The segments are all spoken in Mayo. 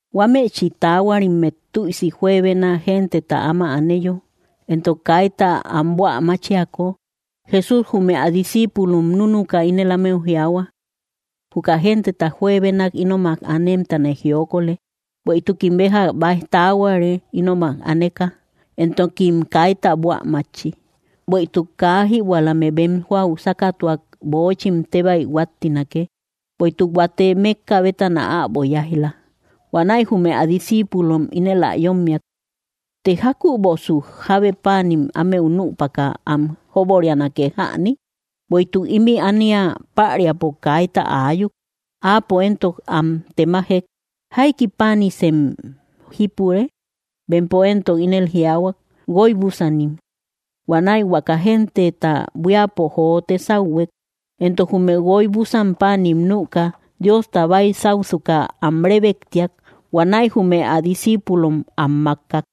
Huámëchi taahuarimmet tüisi juebena genteta áma aneyo, entok kaita am buä máchiako, Jesús jume ä discíipulom núnuka ínel ámeu jiaahua: —Juka genteta juebenak ínomak anemtane jiokolë, bueïtukim béja baij taahuare ínomak aneka, entokim kaita buä mátchi. Bueïtuk kaa jïbuälame bem jóau sákatuak, böochim tébäi huáttinake, bueïtuk huate mékka bétana äbo yáij‑la. Huanäi jume ä discíipulom ínel ä yommiak: —¿Të jákübosu jábe páanim ámeu nüpaka am jóborianake jäni? Bueïtuk ímï ánia päriapo kaita aayuk. Áapo éntok am temajek: —¿Jaiki páanimsem jípure? Bempo éntok inel jiaahuak: —Guoy búsanim. Huanäi huaka genteta buíapo jote sáuhuek. Entok jume guoy búsan páanim nüka, Diosta baysausuka am rébektiak. Huanäi jume ä discíipulom am mákkak,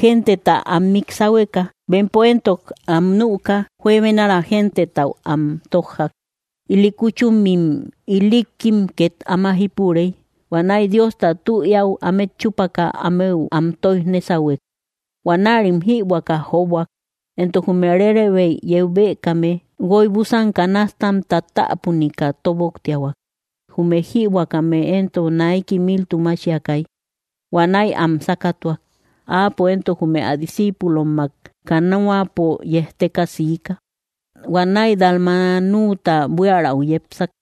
genteta am mik sáhueka. Bempo éntok am nüka, juebenara gentetau am tójjak. Ili kúchumim ilikkim ket áma jípurey. Huanäi Diosta tü éäu ámet chúpaka, ámeu am tóij nésahuek. Huanärim jïbuäka jóboak. Entok jume rérebeim yeu bëkame guoy búsan canastam tátapunika tóboktiahuak. Jume jïbuäkame éntok naiki miltu máchiakay. Huanäi am sákatuak. Áapo éntok jume ä discíipulommak canoapo yejteka siika. Huanäi Dalmanuta buiärau yepsak.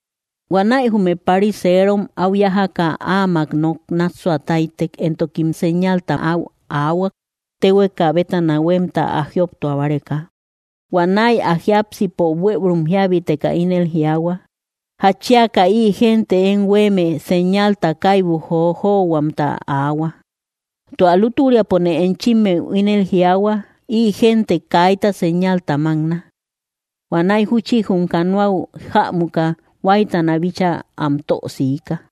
Huanäi jume pariserom áu yájaka, áamak nok nássua táytek. Entokim séñalta áu aahuak, téhueka bétana huemta, ä jioptua báreka. Huanäi ä jiápsipo bueürum jíabiteka ínel jiaahua: —¿Jatchiaka ï gente én huéeme séñalta kaibu jojohuamta aahua? Tua lútüriapone enchimmeu ínel jiaahua, ï gente kaita séñalta mákna. Huanäi júchi jum canoau jämuka, huáytana bíchaa am tö siika.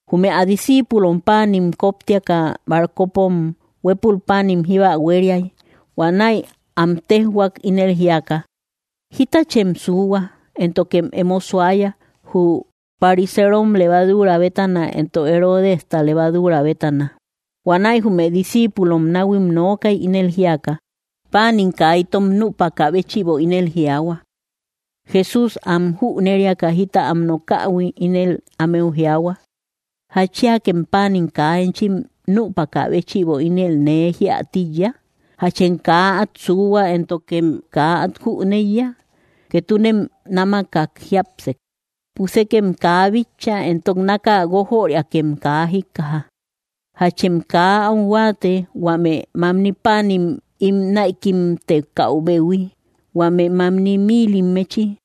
Jume ä discíipulom páanim kóptiaka, barcopom huépul páanim jíba huériay. Huanäi am téjhuak, ínel jíaka: —Jítachem suuhua, éntokem emo suaya jü pariserom levaduura bétana, entok Heródesta levaduura bétana. Huanäi jume discípulom nahuim nookay, ínel jíaka: —Páanim kaa itom nüpakä béchïbo ínel jiaahua. Jesús am jüneriaka jita am nokähui, ínel ámeu jiaahua: —¿Jatchiakem páanim kaa enchim nüpakä béchïbo ínel nee jíä tíiya? ¿Jachem kaa át suuhua, éntokem kaa át jüneiya? ¿Ketunem námakak jiápsek? ¿Pusekem kaa bitcha, entok náka guójöriakem kaa jíkkaja? ¿Jachem kaa áu huáate, huame mamni páanim ín näikimtekäubehui, huame mamni mílimmechi?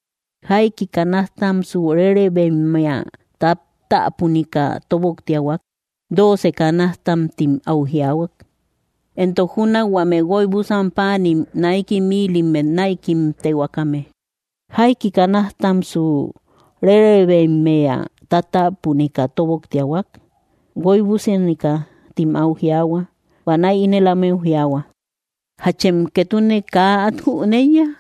¿Jaiki canastamsu rérebeimmea tátapunika tóboktiahuak? —Dóocem kanastam —tim áu jiaahua. —Entok júnak huame guoy búsan páanim naiki mílimmet näikimtehuakame, ¿jaiki canastamsu rérebeimmea tátapunika tóboktiahuak? —Guoy búsanika —tim áu jiaahua. Huanäi ínel ámeu jiaahua: —¿Jáchem ketune kaa át jüneiya?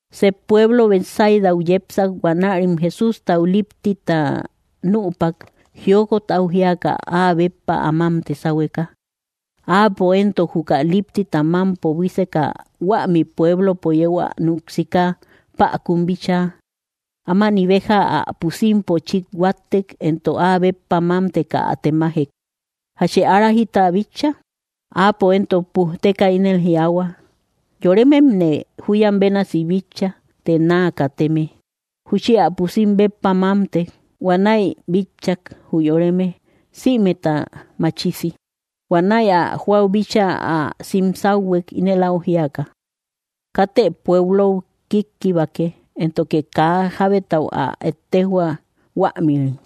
Sep pueblo Betsaidau yepsak. Huanärim Jesústau líptita nüpak, jiokot au jíaka áa béppa ä mámte sáhueka. Áapo éntok juka líptita mámpo buíseka, huämi pueblopo yeu ä núk siika päkun bíchaa. Ámani béja ä pusimpo chít huáttek, entok áa béppa mámteka ä temajek: —¿Jachë ára jita bitcha? Áapo éntok pujteka ínel jiaahua: —Yorememne júyam bénasi bitcha, të naa kateme. Júchi ä pusim béppa mámtek. Huanäi bitchak, jü yoreme, sïmeta machisi. Huanäi ä jóau bíchaa ä sim sáuhuek, ínel áu jíaka: —Katë pueblou kíkkibake, éntoke kaa jábetau ä ettejhua, huämïri.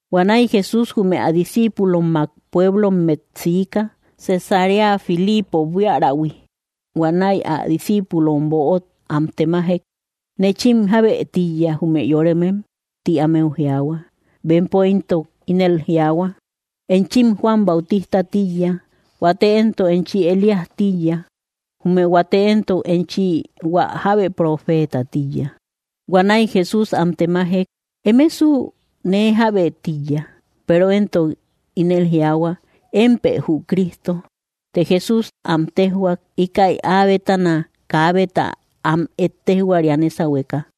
Huanäi Jesús jume ä discíipulommak pueblommet siika, Cesarea Filiipo buíärahui. Huanäi ä discíipulom böot am temajek: —¿Nechim jábë tíiya, jume yoremem? —ti ámeu jiaahua. Bempo éntok ínel jiaahua: —Enchim Juan Bautistä tíiya; huate éntok enchi Elías tíiya; jume huate éntok enchi hua jábe profeeta tíiya. Huanäi Jesús am temajek: —¿Emesu? ¿Nee jábë tíiya? Peero éntok ínel jiaahua: —Émpë jü Cristo. Të Jesús am téjhuak, íkäi áa bétana kaabeta am ettejhuaria nésahueka.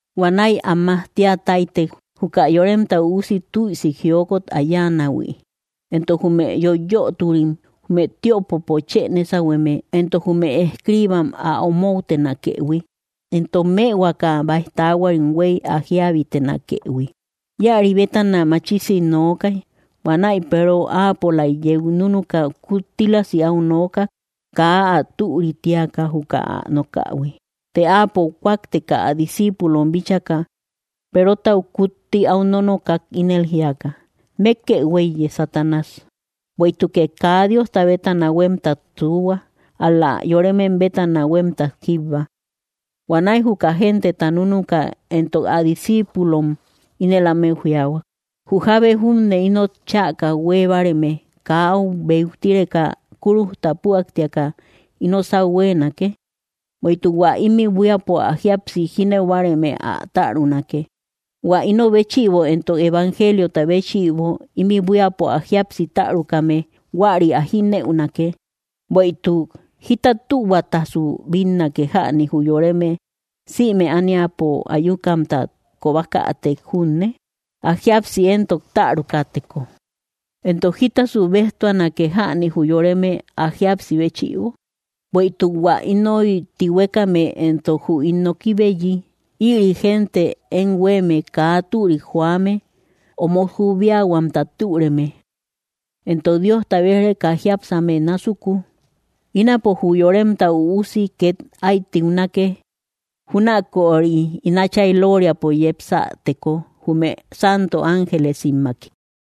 Huanäi am majtia táytek, juka Yoremta Üusi tüisi jiokot ä yáanähui, entok jume yoiyöturim, jume tiöpopo chë nésahueme, entok jume escriibam ä omoutenakëhui, entok mëhuaka báij taahuarim huéy ä jíabitenakëhui. Íäri bétana machisi nookay. Huanäi Peero áapolaik yeu núnuka kuttílasi áu nookak, kaa ä türï tíaka juka ä nokähui. Të Áapo kúakteka ä discíipulom bíchaka, Perotau kutti áu nonokak, ínel jíaka: —¡Mékkë huéiye, Satanás! Bueïtukë kaa Diosta bétana huémtat suuhua, ál‑la yoremem bétana huémtat jíbba. Huanäi juka genteta núnuka, entok ä discíipulom, ínel ámeu jiaahua: —Jü jábe júne inot chäka huée báareme kaa áu beutireka kúrujta púaktíaka ino sáu huéenake. Bueïtuk hua ímï buíapo ä jíapsi jínëu báareme ä tärunake; hua ino béchïbo entok evangeliota béchïbo ímï buíapo ä jíapsi tärukame, huäri ä jínëunake. Bueïtuk, ¿jita tühuatasu bínnake jäni jü yoreme, sïme ániapo ayukamta kobakätek junne, ä jíapsi éntok tärukäteko? Entok, ¿jítasasu béjtuanake jäni jü yoreme, ä jíapsi béchïbo? Bueïtuk hua inoy tihuekame entok jü ín nokibeyi, ïri gente én huéeme kaa türik joame omot jubiahuamta türeme; entok Diosta bej-reka jiápsame násuku. Ínapo jü Yoremta Üusi ket ái tiunake, júnaköri ín Átchay loriapo yepsäteko jumé santo ángelesimmaki.